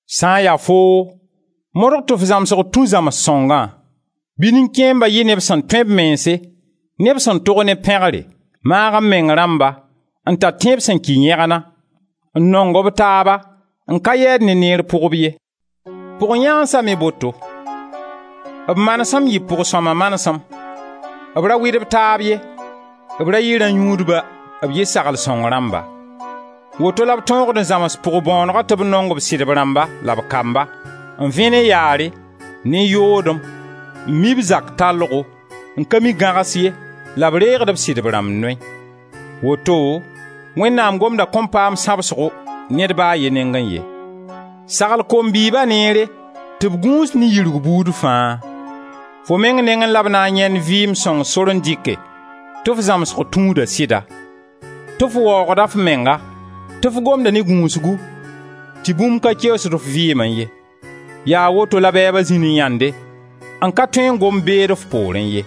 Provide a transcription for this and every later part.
Sã n ya foo, modg tɩ f zãmsg tũ Zãms-sõngã. Bɩ nin-kẽemba yɩ neb sẽn tõe b mense, neb sẽn tog ne pẽgre, maag-m-meng rãmba, n tar tẽeb sẽn kɩ yẽgna, n nong b taaba, n ka yɛɛd ne neer pʋgb ye. Pʋg-yãansa me boto. B manesem yɩ pʋg-sõma manesem, b ra wɩd b taab ye, b ra yɩ rã-yũudba, b yɩ sagl-sõng rãmba. Woto la b tõogd n zãms pʋg-bõonegã tɩ b nong b sɩdb rãmba la b kamba, n vẽ ne yaare, ne yoodem, n mi b zak tallgo, n ka mi gãgs ye la b reegd b sɩdb rãmb noy; woto Wẽnnaam gomda kõn paam sãbsgo ned ba a ye nengẽ ye. Sagl kom-bɩɩba neere tɩ b gũus ne yirgu buud fãa. Fo meng nengẽ la b na n yãend vɩɩm sõng sor n dɩke, tɩ f zãmsg tũuda sɩda, tɩ f waoogda f menga, tɩ f gomda ne gũusgu, tɩ bũmb ka keoosd f vɩɩmẽ ye; yaa woto la bɛɛba zĩ ne yãnde, n ka tõe n gom beed f poorẽ ye.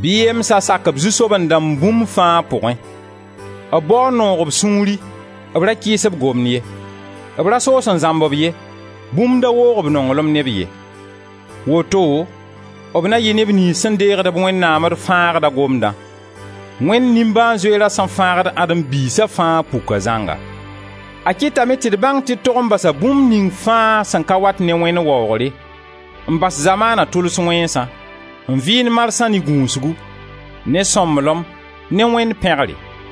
Bɩ yemsa sak b zu-soaben-dãmb bũmb fãa pʋgẽ. B bao n noog b sũuri, b ra kɩɩs b gomd ye. B ra soos n zãmb-b ye, bũmb da woog b nonglem ne b ye. Woto b na yɩ neb niyns sẽn deegd Wẽnnaam d Fãagda gomdã. Wẽnd nimbãan-zoeerã sẽn fãagd Adem biisa fãa puka zãnga. A kɩtame tɩ d bãng tɩ d tog n basa bũmb ning fãa sẽn ka wat ne Wẽnd waoogre, n bas zamaana tʋls wẽnsã, n vɩɩnd marsã ne gũusgu, ne sõmblem, ne Wẽnd pẽgre.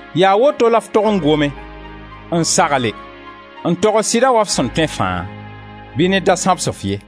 Yaa woto la f tog n gome, n sagle, n togs sɩda wa f sẽn tõe fãa. Bɩ ned da sãbs-f ye.